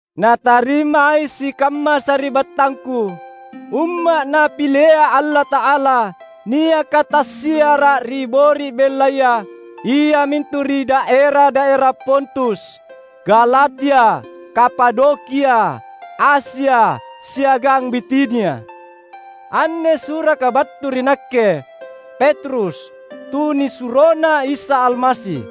Natarimai sikamma sari’battangku, umma’ Napilea Allata’ala, niaka tassiara’ ri bori’ bellaya, iamintu ri daera-daera Pontus, Galatia, Kapadokia, Asia, siagang Bitinia. Anne suraka battu ri nakke, Petrus, tunisuroNa Isa Almasi;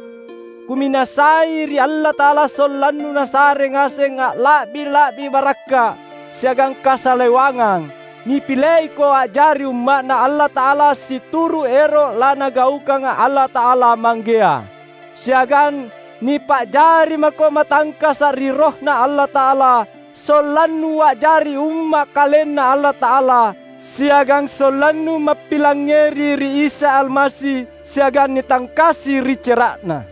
kuminasai ri Allata’ala sollannu Nasare ngaseng alla’bi-la’bi barakka’ siagang kasalewangang. Nipileiko a’jari Umma’Na Allata’ala situru’ ero’ laNagaukanga Allata’ala Manggea. Siagang nipa’jari mako matangkasa’ ri RohNa Allata’ala sollannu a’jari Umma’ KalenNa Allata’ala, siagang sollannu mappilangngeri ri Isa Almasi siagang nitangkasi ri cera’Na.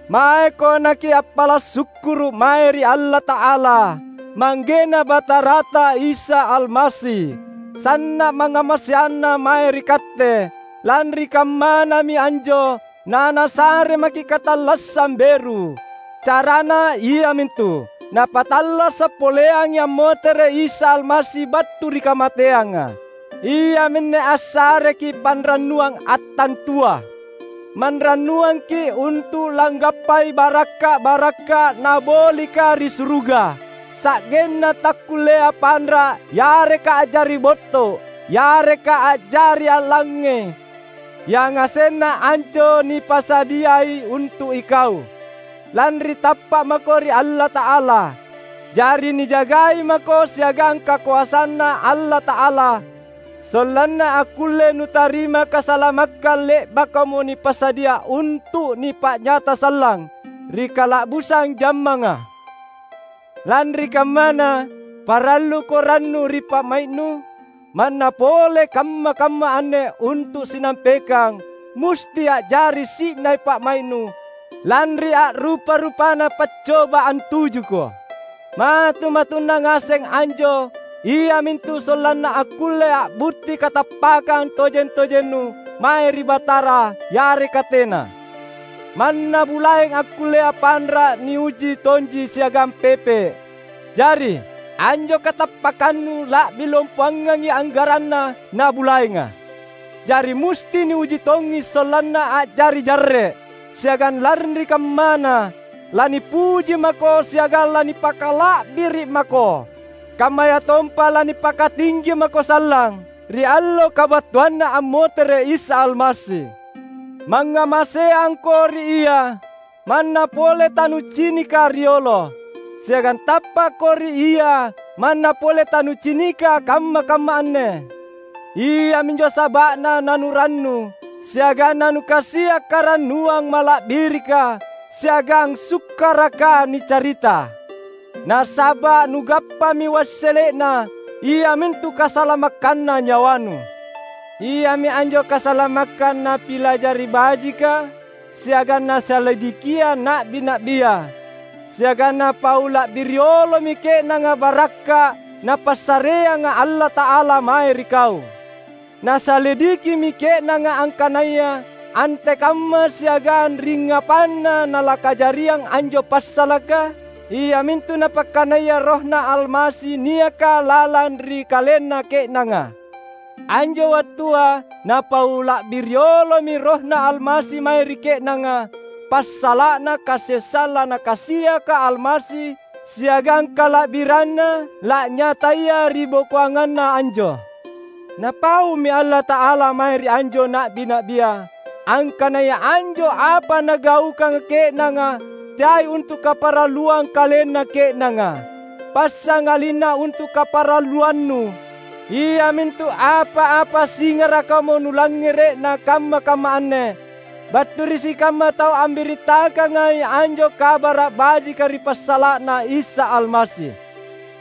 Maeko nakiappala’ sukkuru’ mae ri Allata’ala, ManggeNa Batarata Isa Almasi! Sanna’ mangngamaseanNa mae ri katte; lanri kammanami anjo naNasare maki’ katallassang beru. Carana iamintu, Napattallasa’ poleangi ammotere’ Isa Almasi battu ri kamateanga. Iaminne assareki’ panrannuang attantua. Manrannuangki’ untu’ langgappai barakka’-barakka’ Nabolika ri suruga, sa’genna takkullea panra’ yareka a’jari botto’, yareka a’jari a’langnge. Yangasenna anjo nipasadiai untu’ ikau, lanri tappa’ mako ri Allata’ala. Jari nijagai mako siagang kakoasanNa Allata’ala, sollanna akkulle nutarima kasalamakkang le’bakamo nipasadia untu’ nipa’nyata sallang ri kala’busang jammanga. Lanri kammana, paralluko rannu ri pa’mai’nu, manna pole kamma-kamma anne untu’ sinampekang musti a’jari si’nai pa’mai’nu lanri a’rupa-rupana paccoba antujuko. Matu-matunna ngaseng anjo iamintu sollanna akkulle a’butti katappakkang tojeng-tojennu mae ri Batara yareka tena. Manna bulaeng akkullea panra’ niuji tonji siagang pepe’. Jari, anjo katappakkannu la’bi lompoangangi anggaranna na bulaenga; jari musti niuji tongi sollanna a’jari jarre’. Siagang lanri kammana, lanipuji mako siagang lanipakala’biri’ mako, kammayatompa lanipakatinggi mako sallang ri allo kabattuanNa ammotere’ Isa Almasi. Mangngamaseangko ri Ia, manna pole tanucinika riolo. Siagang tappakko ri Ia manna pole tanucinika kamma-kamma anne. Iaminjo saba’na nanurannu, siagang nanukasia’ karannuang mala’birika siagang sukkaraka nicarita. Nasaba’ nugappami wassele’na, iamintu kasalamakkanna nyawanu. Iami anjo kasalamakkang napilajari bajika siagang nasalidikia na’bi-na’bia; siagang napau la’bi riolomi ke’nanga barakka’ Napassareanga Allata’ala mae ri kau. Nasalidikimi ke’nanga angkanaya antekamma siagang ringngapanna nalakajariang anjo passalaka, iamintu Napakkanaya RohNa Almasi niaka lalang ri kalenna ke’nanga. Anjo wattua napau la’bi riolomi RohNa Almasi mae ri ke’nanga passala’na kasessang laNakasiaka Almasi siagang kala’biranNa la’nyataya ribokoanganna anjo. Napaumi Allata’ala mae ri anjo na’bi-na’bia angkanaya anjo apa nagaukanga ke’nanga teai untu’ kaparalluang kalenna ke’nanga, passangalinna untu’ kaparalluannu; iamintu apa-apa singarakamo nulangngere’na kamma-kamma anne battu ri sikamma tau ambirittakangai anjo Kabara’ Baji’ ri passala’na Isa Almasi.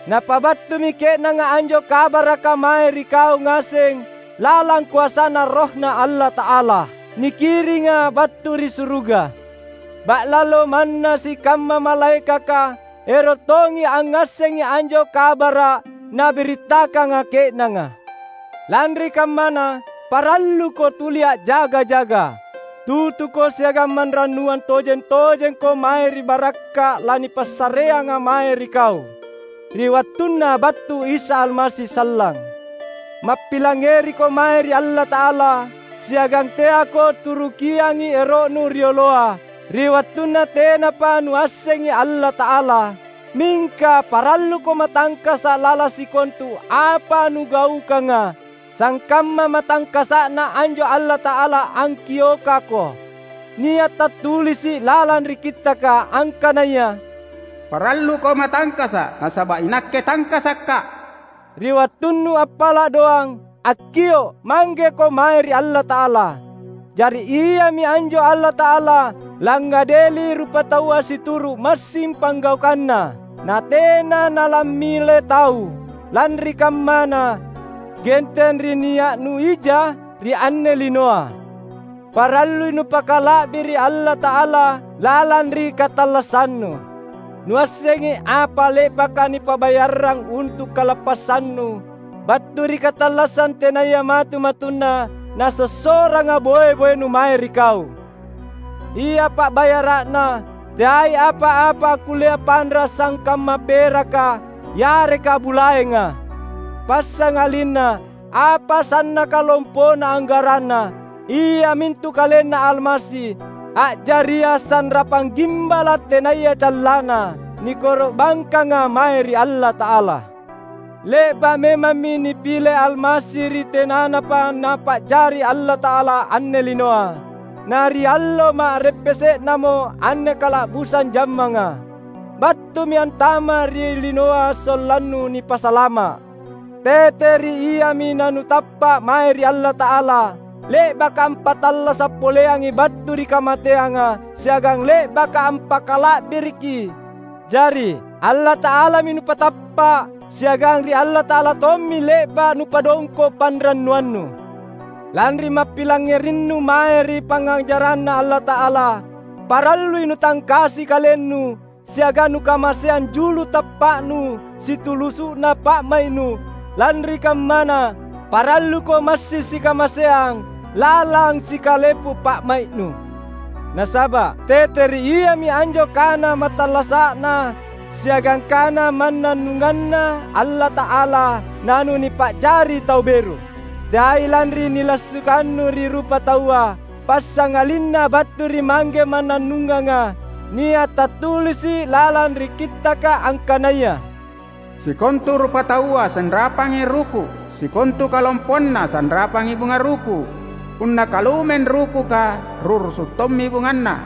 Napabattumi ke’nanga anjo kabaraka mae ri kau ngaseng lalang koasaNa RohNa Allata’ala, nikiringa battu ri suruga. Ba’lalo manna sikamma malaekaka ero’ tongi angngassengi anjo kabara’ nabirittakanga ke’nanga. Lanri kammana, paralluko tuli a’jaga-jaga. Tutuko siagang manrannuang tojeng-tojengko mae ri barakka’ lanipassareanga mae ri kau ri wattunna battu Isa Almasi sallang. Mappilangngeriko mae ri Allata’ala, siagang teako turukiangi ero’nu rioloa, ri wattunna tenapa nuassengi Allata’ala. Mingka, paralluko matangkasa’ lalang sikontu apa nugaukanga, sangkamma matangkasa’Na anjo Allata’ala angkiokako. Nia’ tattulisi’ lalang ri Kittaka angkanaya, "Paralluko matangkasa’, nasaba’ iNakke tangkasaka’." Ri wattunnu appala’ doang, akkio’ Manggeko mae ri Allata’ala. Jari, Iami anjo Allata’ala langngadeli rupataua situru’ massing panggaukanna; na tena nalammile tau. Lanri kammana, genteng ri nia’nu ija ri anne linoa, parallui nupakala’biri’ Allata’ala lalang ri katallassannu. Nuassengi apa le’baka nipa’bayarrang untu’ kalappassannu battu ri katallassang tenaya matu-matunna nasossoranga boe-boenu mae ri kau. Ia pa’bayara’na teai apa-apa akkullea panra’ sangkamma peraka yareka bulaenga, passangalinna apa sannaka lompona anggaranna; iamintu KalenNa Almasi, a’jaria sanrapang gimbala’ tenaya callanna, nikoro’bangkanga mae ri Allata’ala. Le’ba’ memammi nipile Almasi ri tenanapa Napa’jari Allata’ala anne linoa. Na ri allo ma’reppese’namo anne kala’busang jammanga, battumi antama’ ri linoa sollannu nipasalama’. Tete ri Iami nanutappa’ mae ri Allata’ala, le’baka ampattallasa’ poleangi battu ri kamateanga siagang le’baka ampakala’biriki. Jari, Allata’alami nupatappa’, siagang ri Allata’ala tommi le’ba’ nupadongko’ panrannuannu. Lanri mappilangngerinnu mae ri pangngajaranNa Allata’ala, parallui nutangkasi kalennu siagang nukamaseang julu tappa’nu situlusu’na pa’mai’nu. Lanri kammana, paralluko massing sikamaseang lalang sikalepu pa’mai’nu, nasaba’ tete ri Iami anjo kana mattallasa’Na siagang kana mannannunganNa Allata’ala nanunipa’jari tau beru; teai lanri nilassukannu ri rupataua, passangalinna battu ri Mangge mannannunganga. Nia’ tattulisi’ lalang ri Kittaka angkanaya, "Sikontu rupataua sanrapangi ruku’, sikontu kalompoanna sanrapangi bunga ruku’. Punna kalumeng rukuka, ru’rusu’ tommi bunganna;